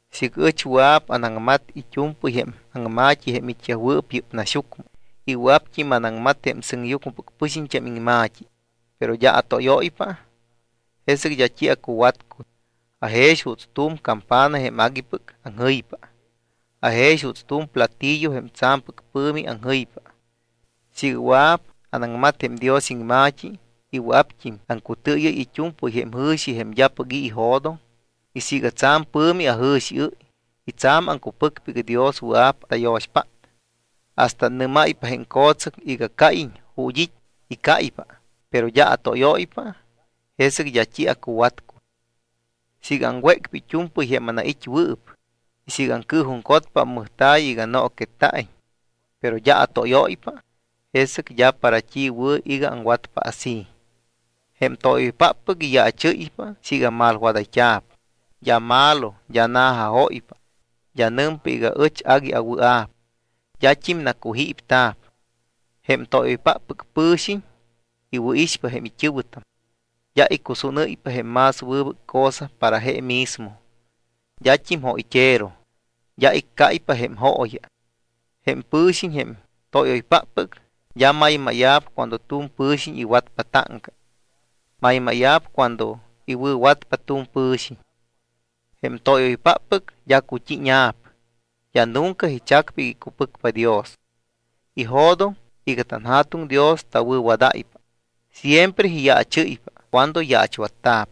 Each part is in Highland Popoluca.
Siiga ɨch wɨa̱p anaŋmat it́u̱mpɨy jém aŋma̱t́i jém it́yajwɨɨp yɨ́p naxyucmɨ y wɨa̱pt́im anaŋmat jém sɨŋyucmɨpɨc pɨxiñt́am iŋma̱t́i, pero d́a atóyóypa, jesɨc d́a t́i acuwatcuy. Ajex juuts tu̱m campana jém aguipɨc aŋjɨypa. Ajex juuts tu̱m platillo jém tsa̱mpɨc pɨ̱mi aŋjɨypa. Siiga wɨa̱p anaŋmat jém Dios iŋma̱t́i y wɨa̱pt́im aŋcutɨɨyɨ́y it́u̱mpɨy jém jɨ̱xi jém d́apɨc i̱ ijo̱doŋ y siiga tsa̱m pɨ̱mi ajɨ̱xiɨ́y y tsa̱m aŋcupɨcpa iga Dios wɨa̱p tayo̱xpát hasta annɨ́máypa jém co̱tsɨc iga cáyiñ ju̱t́ it́ y cáypa, pero d́a atóyóypa, jesɨc d́a t́i acuwatcuy. Siiga aŋwécpa it́u̱mpɨy jém anait́wɨɨp y siiga acɨɨjuŋcotpa ammɨjta̱y iga nooquetta̱iñ, pero d́a atóyóypa, jesɨc d́a para t́i wɨ̱ iga aŋwatpa así. Jém tóyoypáppɨc iyaachɨ́ypa siiga malwadayt́a̱p, d́a malo, d́a na̱jajóypa, d́a nɨmpa iga ɨch agui awɨa̱p, d́at́im nacujípta̱p. Jém tóyoypáppɨc pɨ̱xiñ iwɨ̱ixpa jém it́ɨ̱wɨtam, d́a icusúnɨ́ypa jém más wɨbɨc cosa para je mismo, d́at́im jóyt́ero, d́a iccáypa jém jooya. Jém pɨ̱xiñ, jém tóyoypáppɨc, d́a maymáya̱p cuando tu̱m pɨ̱xiñ iwatpa táŋca, maymáya̱p cuando iwɨ̱watpa tu̱m pɨ̱xiñ. Jém tóyoypáppɨc d́a cut́íña̱p. D́a nunca ichacpa iga icupɨcpa Dios, ijo̱doŋ iga tanJa̱tuŋ Dios tawɨ̱wadáypa. Siempre iyaachɨ́ypa cuando yaachwatta̱p.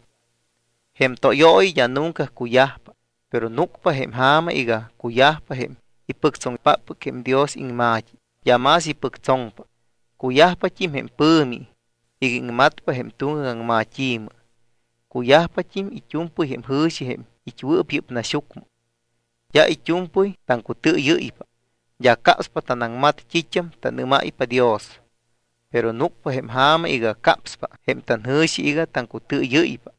Jém tóyooyi d́a nunca cuyajpa. Pero núcpa jém ja̱ma iga cuyajpa jém ipɨctsoŋpáppɨc jém Dios iŋma̱t́i, d́a más ipɨctsoŋpa. Cuyajpat́im jém pɨ̱mi iga iŋmatpa jém tuŋgac aŋmat́i̱mɨ. Cuyajpat́im it́u̱mpɨy jém jɨ̱xi jém it́wɨɨp yɨ́p naxyucmɨ. D́a it́u̱mpɨy taŋcutɨɨyɨ́ypa. D́a capspa tanaŋmat t́it́am tanɨ́máypa Dios. Pero núcpa jém ja̱ma iga capspa jém tanjɨ̱xi iga taŋcutɨɨyɨ́ypa.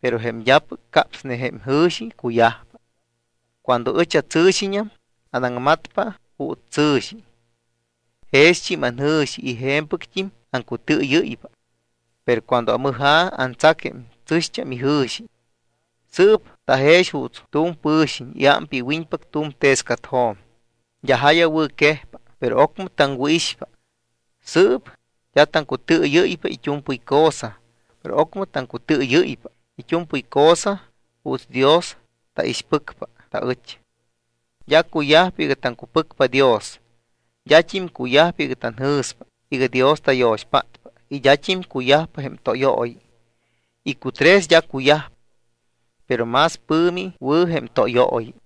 Pero jém d́apɨc capsne jém jɨ̱xi, cuyajpa. Cuando ɨch atsɨ̱xiñam, aŋmatpa juuts tsɨ̱xi, jext́im anjɨ̱xi y je̱mpɨct́im aŋcutɨɨyɨ́ypa. Pero cuando amɨja̱, antsac jém tsɨ̱xt́am ijɨ̱xi. Sɨɨp tajex juuts tu̱m pɨ̱xiñ iámpa iwiñpac tu̱m tescatjo̱m d́a ja̱yawɨ̱quejpa. Pero ocmɨ taŋwɨ̱ixpa. Sɨɨp d́a taŋcutɨɨyɨ́ypa it́u̱mpɨy cosa, pero ocmɨ taŋcutɨɨyɨ́ypa it́u̱mpɨy cosa juuts Dios taixpɨcpa taɨch. D́a cuyajpa iga taŋcupɨcpa Dios, d́at́im cuyajpa iga tanjɨ̱spa iga Dios tayo̱xpátpa y d́at́im cuyajpa jém tóyooyi. Icutres d́a cuyajpa. Pero más pɨ̱mi wɨ̱ jém tóyooyi.